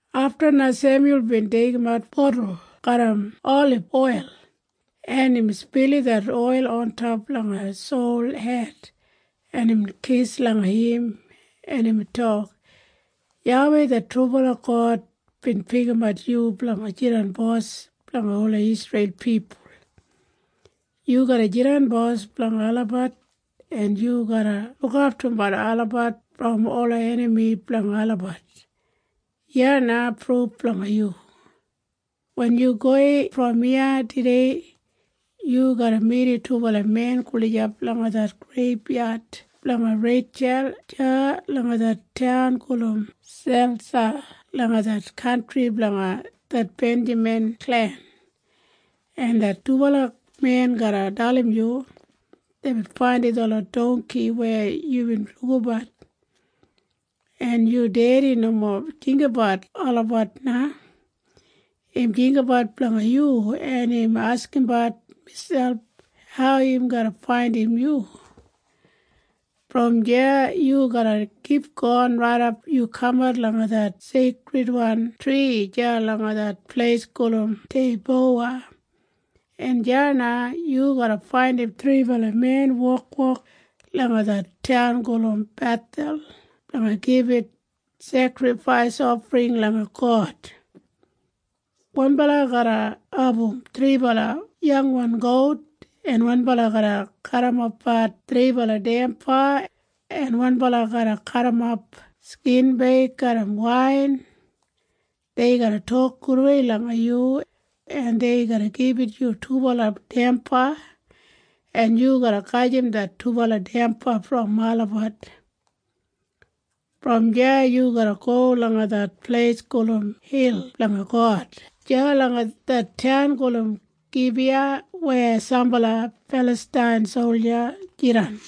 Afta na Semyul bin deigimat wan botul garram oliboil, en imbin spilim det oil ontop langa Sol hed, en imbin kis langa im, en imbin tok, “YAWEI det trubala God bin pikimat yu blanga jidan bos blanga ola Isreil pipul. Yu garra jidan bos blanga olabat, en yu garra lukaftumbat olabat brom ola enami blanga olabat. Iya na pruf blanga yu. Wen yu gowei brom iya tudei, yu garra midim dubala men gulijap langa det greibyad blanga Reitjul deya langa det taun gulum Selsa langa det kantri blanga det Benjamin klen, en det dubala men garra dalim yu, ‘Deibin faindim detlot dongki weya yubin lukabat, en yu dedi nomo jinggabat olabat na. Im jinggabat blanga yu, en im askimbat miselp hau im garra faindim yu.’ “Brom deya yu garra kipgon raidap yu kamat langa det seikridwan tri deya langa det pleis gulum Teibowa, en deya na yu garra faindim thribala men wokwok langa det taun gulum Bethel blanga gibit sekrifais ofring langa God. Wanbala garra abum thribala yangwan gout, en wanbala garra garrimapbat thribala damba, en wanbala garra garrimap skinbeig garram wain. Dei garra tok gudei langa yu, en dei garra gibit yu dubala damba, en yu garra gajim det dubala damba brom olabat. “Brom deya yu garra go langa det pleis gulum Hil Blanga God deya langa det taun gulum Gibiya weya sambala Filastain solja jidan.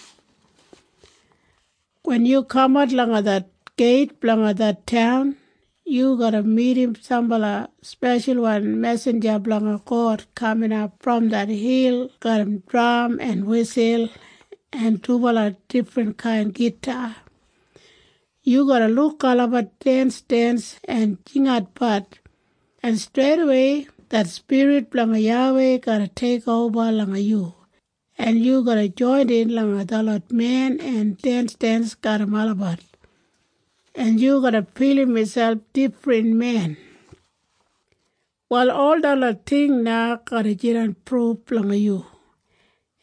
Wen yu kamat langa det geit blanga det taun, yu garra midim sambala speshalwan mesinja blanga God kaminap brom det hil garram dram en wisul en dubala difrinkain gita. Yu garra luk olabat densdens en jingatbat, en streidawei det spirit blanga YAWEI garra teikoba langa yu, en yu garra joinin langa detlot men en densdens garram olabat, en yu garra filim miselp difrin men. “Wal ol detlot ting na garra jidan pruf blanga yu,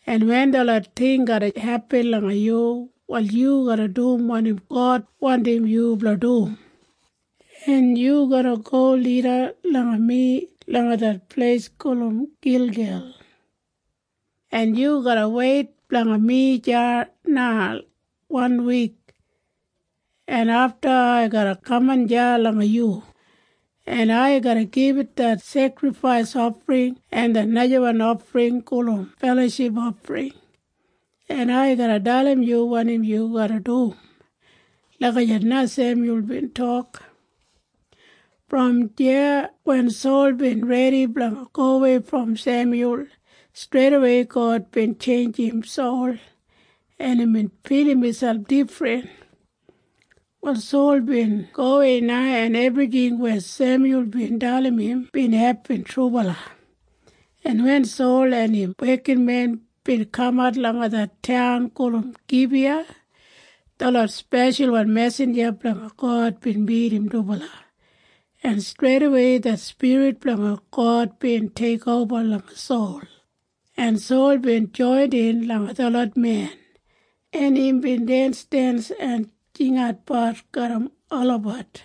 en wen detlot ting garra hepin langa yu, wal yu garra dum wanim God wandim yu blanga dum, en yu garra go lida langa mi langa det pleis gulum Gilgel, en yu garra weit blanga mi deya na wan wik, en afta ai garra kaman deya langa yu, en ai garra gibit det sekrifais ofring en det najawan ofring gulum feloship ofring, en ai garra dalim yu wanim yu garra dum.” Lagijat na Semyul bin tok. Brom deya wen Sol bin redi blanga gowei brom Semyul, streidawei God bin tjeinjim Sol, en imbin filim miselp difrin. Wal Sol bin gowei na, en ebrijing weya Semyul bin dalim im bin hepin trubala, en wen Sol en im wekinmen bin kamat langa det taun gulum Gibiya, detlot speshalwan mesinja blanga God bin midim dubala, en streidawei det spirit blanga God bin teikoba langa Sol, en Sol bin joinin langa detlot men, en imbin densdens en jingatbat garram olabat.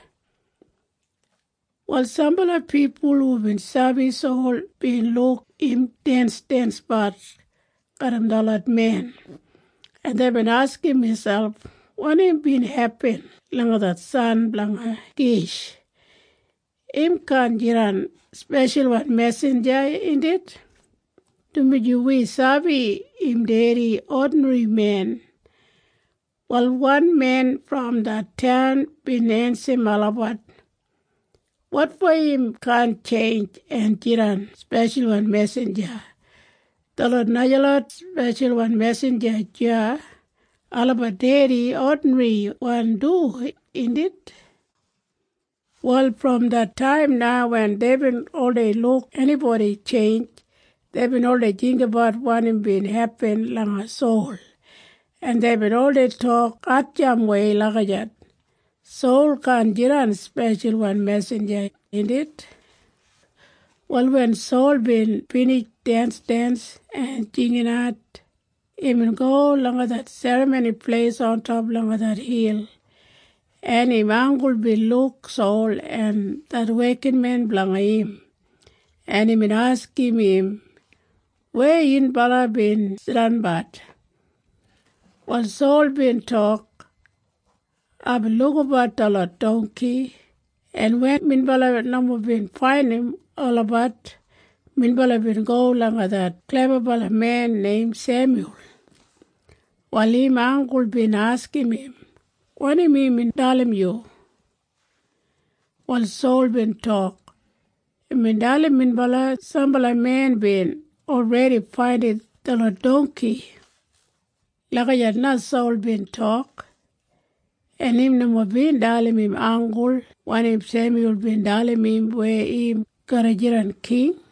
Wal sambala pipul hubin sabi Sol bin luk im densdensbat garram detlot men, en deibin askim miselp, “Wanim bin hepin langa det san blanga Kish? Im kaan jidan speshalwan mesinja, indit? Dumaji wi sabi im dedi odinrimen.” Wal wan men brom det taun bin ensim olabat, “Wotfo im kaan tjeinj en jidan speshalwan mesinja? Detlot najalot speshalwan mesinja deya, olabat dedi odinriwan du, indit?” Wal brom det taim na wen deibin oldei luk enibodi tjeinj, deibin oldei jinggabat wanim bin hepin langa Sol, en deibin oldei tok hatjampwei lagijat, “Sol kaan jidan speshalwan mesinja, indit?” Wal wen Sol bin binij densdens en jinginat, imbin go langa det serramoni pleis ontop langa det hil, en im anggul bin luk Sol en det wekinmen blanga im, en imbin askim im, “Weya yunbala bin jidanbat?” Wal Sol bin tok, “Aibin lukabat detlot dongki, en wen minbala nomo bin faindim olabat, minbala bin go langa det klebabalamen neim Semyul.” Wal im anggul bin askim im, “Wanim imbin dalim yu?” Wal Sol bin tok, “Imbin dalim minbala sambala men bin olredi faindim detlot dongki.” Lagijat na Sol bin tok. En im nomo bin dalim im anggul wanim Semyul bin dalim im weya im garra jidan king.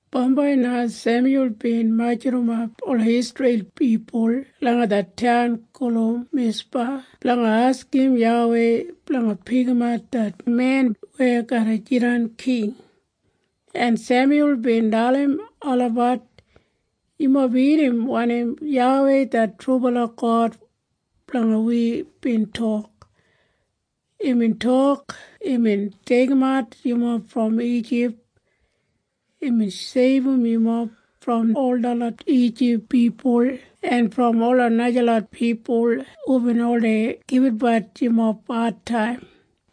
Bambai na Semyul bin majurrumap ola Isreil pipul langa det taun gulum Mispa blanga askim YAWEI blanga pikimat det men weya garra jidan king. En Semyul bin dalim olabat, “Yumob irrim wanim YAWEI det trubala God blanga wi bin tok. Imbin tok imbin deigimat yumob brom Ijip. Imbin seibum yumob brom ol detlot Ijip pipul en brom ola najalot pipul hubin oldei gibitbat yumob adtaim.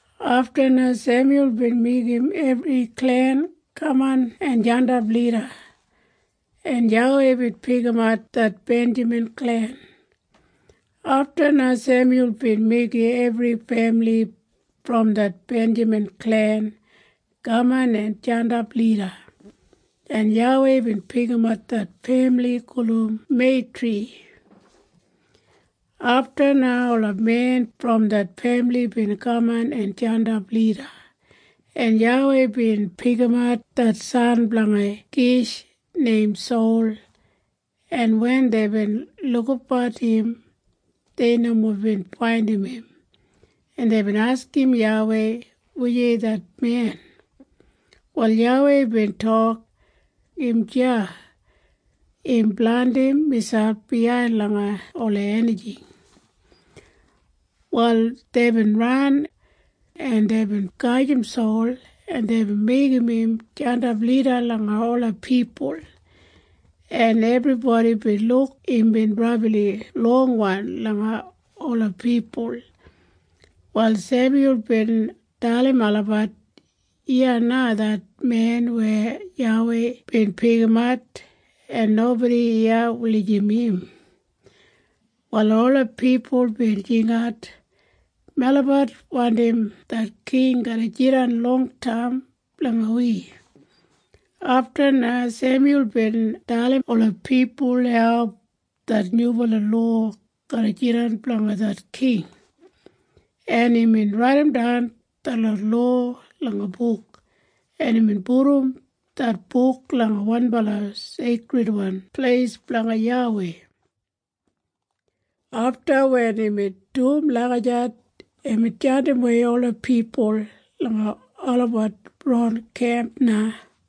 Afta na Semyul bin meigim ebri klen kaman en jandap lida, en YAWEI bin pikimat det Benjamin klen. Afta na Semyul bin meigim ebri femili brom det Benjamin klen kaman en jandap lida, en YAWEI bin pikimat det femili gulum Meitri. Afta na ola men brom det femili bin kaman en jandap lida, en YAWEI bin pikimat det san blanga Kish neim Sol. En wen deibin lukabat im, dei nomo bin faindim im, en deibin askim YAWEI, “Wujei det men?” Wal YAWEI bin tok, “Im deya. Im blandim miselp biyain langa ola enijing.” Wal deibin ran, en deibin gajim Sol, en deibin meigim im jandap lida langa ola pipul, en ebribodi bin luk imbin brabli longwan langa ola pipul. Wal Semyul bin dalim olabat, “Iya na det men weya YAWEI bin pikimat. En nobodi iya wulijim im.” Wal ola pipul bin jingat, “Melabat wandim det king garra jidan longtaim blanga wi!” Afta na Semyul bin dalim ola pipul hau det nyubala lowa garra jidan blanga det king, en imbin raidimdan detlot lowa langa buk, en imbin pudum det buk langa wanbala seikridwan pleis blanga YAWEI. Afta wen imbin dum lagijat, imbin jandimwei ola pipul langa olabat ron kemp na.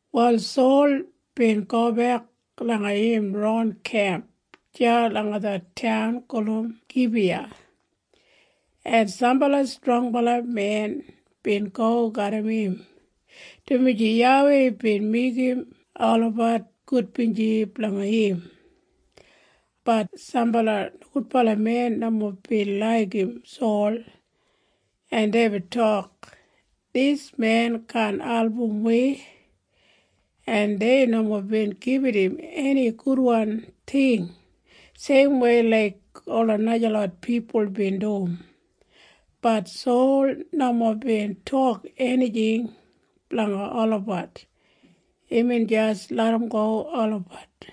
Wal Sol bin gobek langa im ron kemp deya langa det taun gulum Gibiya, en sambala strongbala men bin go garram im, dumaji YAWEI bin meigim olabat gudbinji blanga im. Bat sambala nogudbala men nomo bin laigim Sol, en deibin tok, “Dis men kaan album wi!” En dei nomo bin gibit im eni gudwan ting seimwei laik ola najalot pipul bin dum. Bat Sol nomo bin tok enijing blanga olabat. Imbin jis larramgo olabat.